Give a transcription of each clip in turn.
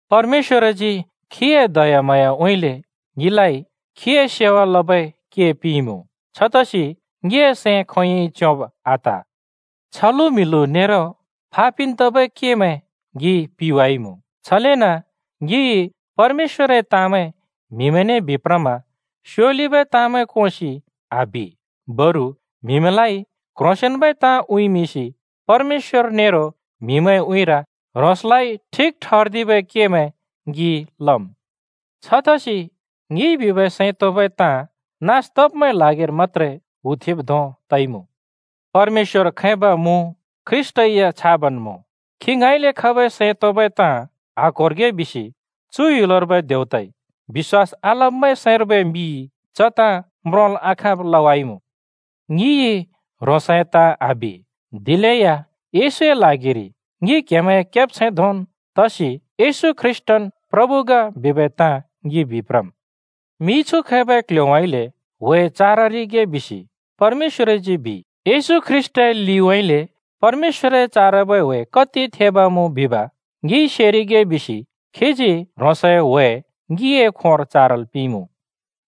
परमेश्‍वरजी खीए दयाम्हाँयाउँइँले ङिलाइ खीए सेवा लबै के पिंइमुँ। छतसि ङिए सैं खोंयोंइ च्योंब आत। छलु-म्हिलु नेरो फा पिन् तबै केमैं ङिइ पिवाइमुँ। छलेन ङिइ परमेश्‍वरए ताँमैं म्हिमैंने बिप्रमा स्योलिबै ताँमैं कोंसि आबि। बरु म्हिमैंलाइ क्ह्रोंसेंन्बै ताँ उँइँमिंसि परमेश्‍वर नेरो म्हिमैंए उँइँर ह्रोंसलाइ ठिक ठर्दिबै केमैं ङि लम्। छतसि ङिइ बिबै सैं तोंबै ताँ नास तब्मैंए ल्हागिर मत्‍त्रे हुथेंब् धों तइमुँ। परमेश्‍वर खैब मुँ, ख्रीष्‍टै या छाबन् मुँ। खी ङाँइँले खबै सैं तोंबै ताँ आक्होरिगे बिसि चु ह्‍युलर्बै देवताइ बिश्‍वास आलब्मैंए सैंर्बै मिइ च ताँ म्रोंल् आखाँब लवाइमुँ। ङिइ ह्रोंसए ताँ आबि, दिलेया येशूए ल्हागिर ङि क्‍हेमैंए केब्छैंमैं धोंन् तसि येशू ख्रीष्‍टन् प्रभु ग बिबै ताँ ङि बिप्रम्। “मिछु खैबै क्‍ल्‍ह्‍योउँइँले ह्‍वे चाररिगे” बिसि परमेश्‍वरजी बिइ। येशू ख्रीष्‍टए लिउँइँले परमेश्‍वरए चारबै ह्‍वे कति थेब् मुँ बिब ङिइ सेरिगे बिसि खीजी ह्रोंसए ह्‍वे ङिए खोंर चारल् पिंइमुँ।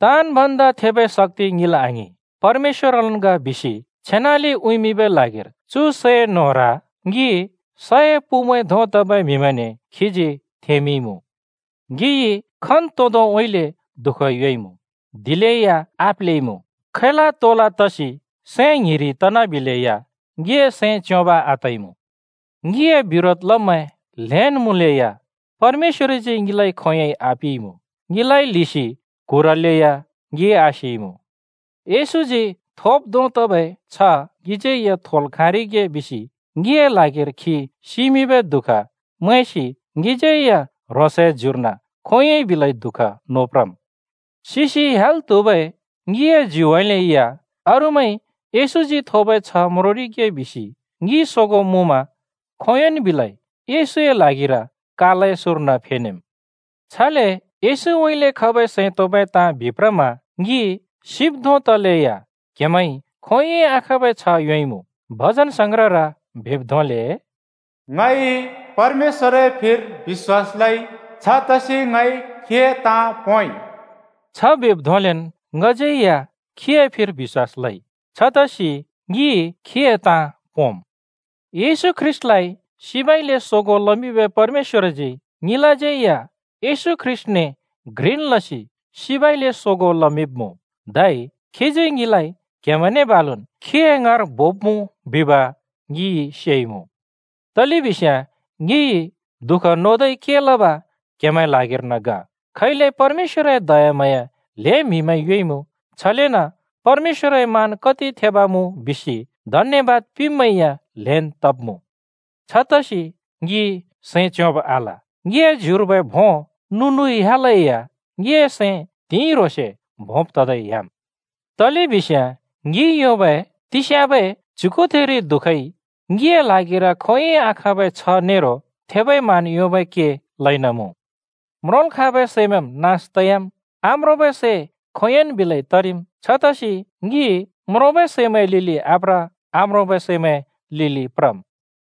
ताँन् भन्दा थेबै शक्‍ति ङिल आङिं, परमेश्‍वरलन् ग बिसि छेनाले उँइँमिंबै ल्हागिर चु सै न्होर ङि सए पुमैं धों तबै म्हिमैंने खीजी थेंमिंइमुँ। ङिइ खन्तोंदोंउँइँले दुःख योंइमुँ, दिलेया आप्लेइमुँ। खैला-तोला तसि सैं ङ्हिरि तनाबिलेया ङिए सैं च्योंब आतइमुँ। ङिए बिरोध लब्मैं ल्‍हेंन् मुँलेया परमेश्‍वरजी ङिलाइ खोंयोंइ आपिइमुँ। ङिलाइ ल्हिसि क्हुरलेया ङि आसिइमुँ। येशूजी थोब् धों तबै छ्ह ङिज्यै या थोल् खाँरिगे बिसि ङिए ल्हागिर खी सिमिंबै दुःख मैंसि ङिज्यै या ह्रोंसए ज्युर्न खोंयोंइ बिलै दुःख नोप्रम्। सिसि ह्‍याल् त्हुबै ङिए ज्युउँइँले या अरूमैंइ येशूजी थोबै छ्ह म्रोंरिगे बिसि ङि सोगों मुँमा खोंयोंन् बिलै येशूए ल्हागिर कालए सुँर्न फेनेम्। छले येशूउँइँले खबै सैं तोंबै ताँ बिप्रमा ङि सिब् धों तलेया क्‍हेमैंइ खोंयोंइ आखाँबै छ्ह योंइमुँ। भजनसंग्रहर बिब् धोंले, “ङइ परमेश्‍वरए फिर बिश्‍वास लइ, छतसि ङइ खीए ताँ पोंइ।” छ बिब् धोंलेन् ङिज्यै या खीए फिर बिश्‍वास लइ, छतसि ङि खीए ताँ पोंम्। येशू ख्रीष्‍टलाइ सिबउँइँले सोगों लमिंबै परमेश्‍वरजी ङिलाज्यै या येशू ख्रीष्‍टने घ्रिन् लसि सिबउँइँले सोगों लमिंब्‍मुँ, धै खीजी ङिलाइ क्‍हेमैंने बालुन् खीए ङाँर बोब्‍मुँ बिब ङि सेइमुँ। तलेबिस्याँ ङिइ दुःख नोदै के लब क्‍हेमैंए ल्हागिर्न ग। खैले परमेश्‍वरए दयाम्हाँया ल्हें म्‍हिमैंइ योंइमुँ, छलेन परमेश्‍वरए मान कति थेब मुँ बिसि धन्‍यबाद पिंब्‍मैं या ल्हेंन् तब्मुँ। छतसि ङि सैं च्योंब आल। ङिए ज्युर्बै भों नु-नुइ ह्‍यालेया ङिए सैं त्हिंइ ह्रोंसे भोंब् ततै ह्‍याम्। तलेबिस्याँ ङिइ योंबै तिस्याँबै च्‍युगुथिरि दुःखइ ङिए ल्हागिर खोंयोंइ आखाँबै छ्ह नेरो थेबै मान योंबै के लइन मुँ। म्रोंल् खाँबै सैमैंम् नास तयाम्, आम्रोंबै सै खोंयोंन् बिलै तरिम्। छतसि ङि म्रोंबै सैमैंए लिलि आप्र, आम्रोंबै सैमैंए लिलि प्रम्।